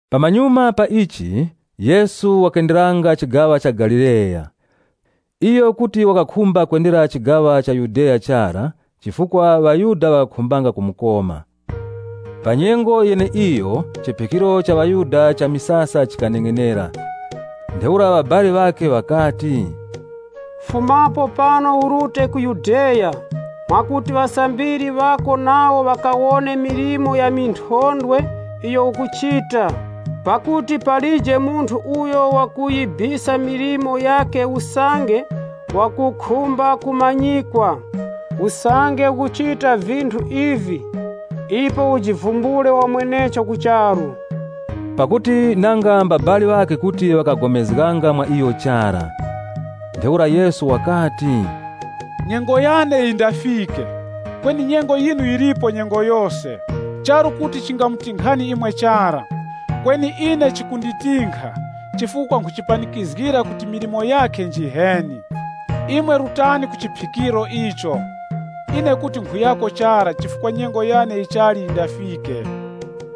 Pamanyuma pa ichi, Yesu wakenderanga chigaŵa cha Galileya. Iyo kuti wakakhumba kwendera chigaŵa cha Yudeya chara chifukwa ŵaYuda ŵakakhumbanga kumukoma. Pa nyengo yeneiyo, chiphikiro cha ŵaYuda cha misasa chikaneng'enera. Ntheura ŵabali ŵakhe ŵakati, “Fumapo pano urute ku Yudeya, mwakuti ŵasambiri ŵako nawo ŵakawone milimo ya minthondwe iyo ukuchita. Pakuti palije munthu uyo wakuyibisa milimo yakhe usange wakukhumba kumanyikwa. Usange ukuchita vinthu ivi, ipo ujivumbule wamwenecho ku charu.” Pakuti nanga mbabali ŵakhe kuti ŵakapulikana mwa iyo chara. Ntheura Yesu wakati, “Nyengo yane yindafike, kweni nyengo yinu yilipo nyengo yose. Charu kuti chingamutinkhani imwe chara, kweni ine chikunditinkha, chifukwa nkhuchipanikizgira kuti milimo yakhe njiheni. Imwe rutani ku chiphikiro icho. Ine kuti nkhuyako chara chifukwa nyengo yane yichali yindafike.”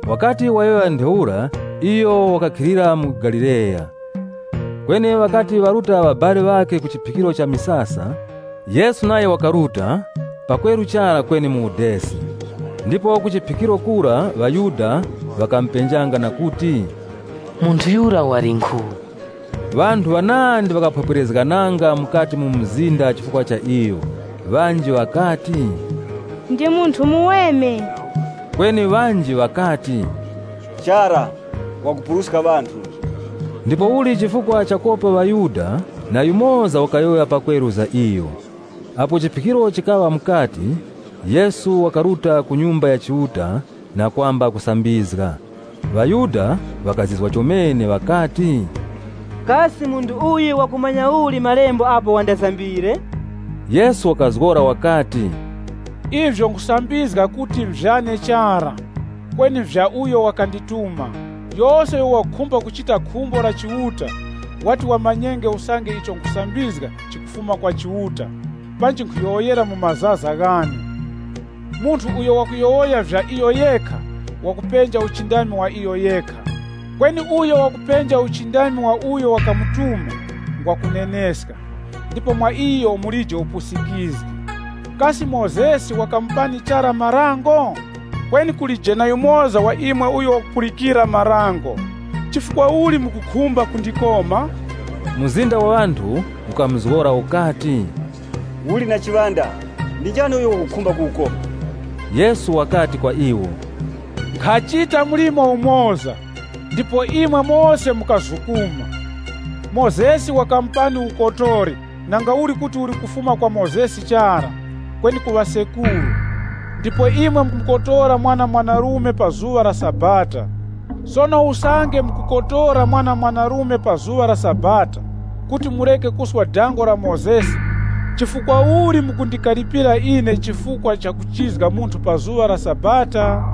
Wakati wayowoya ntheura iyo wakakhalira mu Galileya. Kweni ŵakati ŵaruta ŵabali ŵakhe ku chiphikiro cha misasa, Yesu nayo wakaruta, pakweru chara kweni mu udesi. Ndipo ku chiphikiro kura, ŵaYuda ŵakamupenjanga na kuti, “Munthu yura walinkhu?” Ŵanthu ŵanandi ŵakaphwepwerezgananga mukati mu mzinda chifukwa cha iyo. Ŵanji ŵakati, “Ndi munthu muweme.” Kweni ŵanji ŵakati, “Chara, wakupuruska ŵanthu.” Ndipouli chifukwa chakopa ŵaYuda na yumoza wakayowoya pakweru za iyo. Apo chiphikiro chikaŵa mukati, Yesu wakaruta ku Nyumba ya Chiuta na kwamba kusambizga. ŴaYuda ŵakazizwa chomene ŵakati, “Kasi munthu wakumanya uli malemba, apo wandasambire?” Yesu wakazgora wakati, “Ivyo nkhusambizga kuti nvyane chara, kweni nvya uyo wakandituma. Yose uyo wakukhumba kuchita khumbo la Chiuta, wati wamanyenge usange icho nkhusambizga chikufuma kwa Chiuta panji nkhuyowoyera mu mazaza ghane. Munthu uyo wakuyowoya vya iyo yekha, wakupenja uchindami wa iyo yekha, kweni uyo wakupenja uchindami wa uyo wakamutuma, ngwa kuneneska, ndipo mwa iyo mulije upusikizgi. Kasi Mozesi wakamupani chara Dango? Kweni kulije na yumoza wa imwe uyo wakupulikira Dango. Chifukwa uli mukukhumba kundikoma?” Mzinda wa ŵanthu ukamuzgora ukati, “Uli na chiŵanda! Ndi njani uyo wakukhumba kukukoma?” Yesu wakati kwa iwo, “Nkhachita mlimo umoza, ndipo imwe mose mukazukuma. Mozesi wakamupani ukotori nangauli kuti uli kufuma kwa Mozesi chara, kweni ku ŵasekuru, ndipo imwe mukukotora mwana mwanarume pa zuŵa la Sabata Sono usange mukukotora mwana mwanarume pa zuŵa la Sabata, kuti mureke kuswa Dango la Mozesi, chifukwa uli mukundikaripira ine chifukwa cha kuchizga munthu pa zuŵa la Sabata?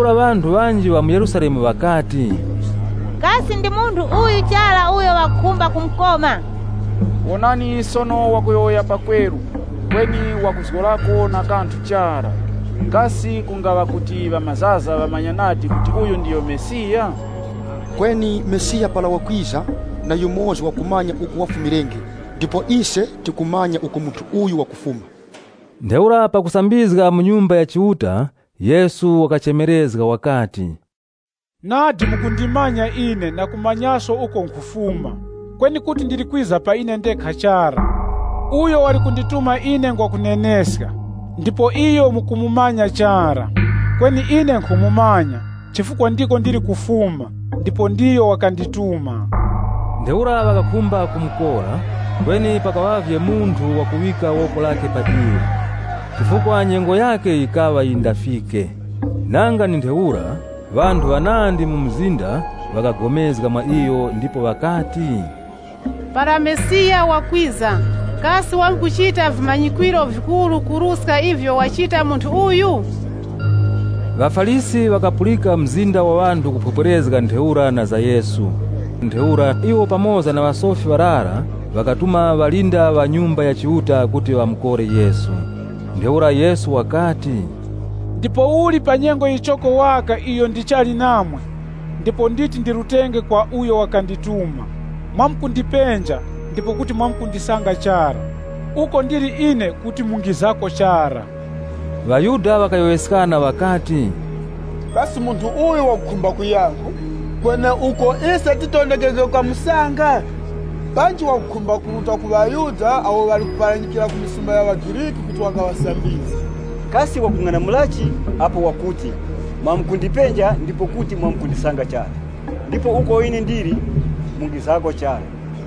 Ntheura ŵanthu ŵanji ŵa mu Yerusalemu ŵakati, “Kasi ndi munthu uyu chara uyo ŵakukhumba kumukoma? Wonani sono wakuyowoya pakweru kweni ŵakuzgorako na kanthu chara. Kasi kungaŵa kuti ŵamazaza ŵamanya nadi kuti uyu ndiyo Mesiya? Kweni Mesiya para wakwiza, na yumoza wakumanya uko wafumirenge, ndipo ise tikumanya uko munthu uyu wakufuma.” Ntheura pakusambizga mu Nyumba ya Chiuta, Yesu wakachemerezga wakati, “Nadi mukundimanya ine na kumanyaso uko nkhufuma. Kweni kuti ndili kwiza pa ine ndekha chara. Uyo wali kundituma ine ngwa kuneneska ndipo iyo mukumumanya chara. Kweni ine nkhumumanya, chifukwa ndiko ndili kufuma ndipo ndiyo wakandituma.” Ntheura ŵakakhumba kumukora, kweni pakaŵavye munthu wakuŵika woko lakhe pa iyo, chifukwa nyengo yakhe yikaŵa yindafike. Nanga ndi ntheura, ŵanthu ŵanandi mu mzinda ŵakapulikana mwa iyo ndipo ŵakati, “Para Mesiya wakwiza, kasi wamkuchita vimanyikwiro vikuru kuruska ivyo wachita munthu uyu.” ŴaFarisi ŵakapulika mzinda wa ŵanthu ukuphwepwerezga ntheura na za Yesu. Ntheura iwo pamoza na ŵasofi ŵarara ŵakatuma ŵalinda ŵa Nyumba ya Chiuta kuti ŵakamukore Yesu. Ntheura Yesu wakati, “Ndipouli pa nyengo yichoko waka iyo ndichali namwe, ndipo nditi ndirutenge kwa uyo wakandituma. Mwamkundipenja, ndipo kuti mwamkundisanga chara. Uko ndili ine kuti mungizako chara.” ŴaYuda ŵakayowoyeskana ŵakati, “Kasi munthu uyu wakukhumba kuyankhu, kweneuko ise titondekenge kukamusanga? Panji wakukhumba kuruta ku ŵaYuda awo ŵali kuparanyikira ku misumba ya ŵaGriki kuti wakaŵasambizge. Kasi wakung'anamulachi, apo wakuti, ‘Mwamkundipenja ndipo kuti mwamkundisanga chara, ndipo uko ine ndili mungizako chara?’”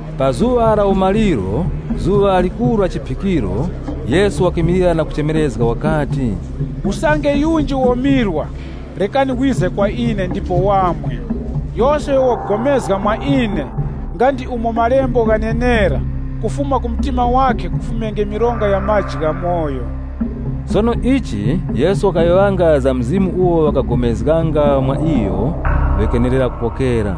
Pa zuŵa la umaliro, zuŵa likuru la chiphikiro, Yesu wakimilira na kuchemerezga, wakati, “Usange yunji womirwa, rekani wize kwa ine ndipo wamwe. Yose uyo wakupulikana mwa ine, nga ndi umo malembo ghanenera, ‘Mironga ya maji ghamoyo yamkufuma mu mtima wakhe.’” Sono ichi Yesu wakayowoyanga za Mzimu uwo awo ŵakapulikana mwa iyo ŵakenera kupokera.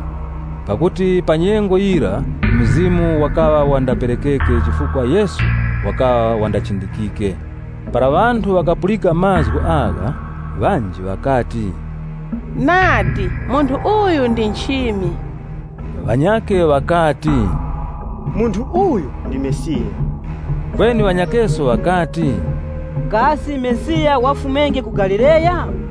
Pakuti pa nyengo yira Mzimu wakaŵa wandaperekeke chifukwa Yesu wakaŵa wandachindikike. Para ŵanthu ŵakapulika mazgu agha, ŵanji ŵakati, “Nadi, munthu uyu ndi nchimi!” Ŵanyakhe ŵakati, “Munthu uyu ndi Mesiya.” Kweni ŵanyakheso ŵakati, “Kasi Mesiya wafumenge ku Galileya?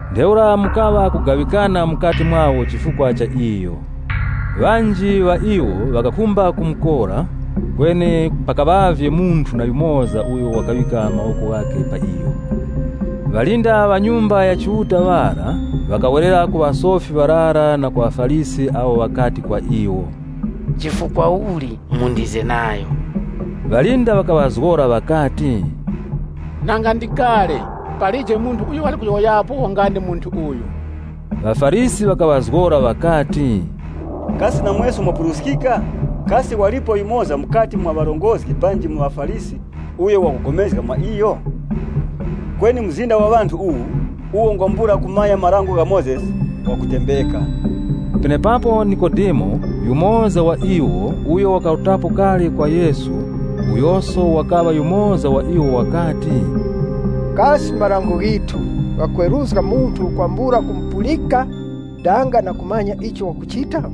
Ntheura mukaŵa kugaŵikana mukati mwawo chifukwa cha iyo. Ŵanji ŵa iwo ŵakakhumba kumukora, kweni pakaŵavye munthu na yumoza uyo wakaŵika mawoko ghakhe pa iyo. Ŵalinda ŵa Nyumba ya Chiuta ŵara ŵakawerera ku ŵasofi ŵarara na ku ŵaFarisi awo ŵakati kwa iwo, “Chifukwa uli mundize nayo?” Ŵalinda ŵakaŵazgora ŵakati, “Nanga ndi kale, palije munthu uyo wali kuyowoyapo nga ndi munthu uyu.” ŴaFarisi ŵakaŵazgora ŵakati, “Kasi namweso mwapuruskika?” “Kasi walipo yumoza mukati mwa ŵarongozgi panji mu ŵaFarisi uyo ŵakupulikana mwa iyo? Kweni mzinda wa ŵanthu uwu, uwo ngwambula kumanya Dango la Mozesi, ngwa kutembeka.” Penepapo Nikodemo yumoza wa iwo, uyo wakarutapo kale kwa Yesu, uyoso wakaŵa yumoza wa iwo wakati, “Kasi marango ghithu ghakweruzga munthu kwambula kumupulika danga na kumanya icho wakuchita?”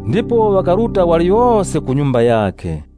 Ndipo ŵakaruta waliyose ku nyumba yakhe,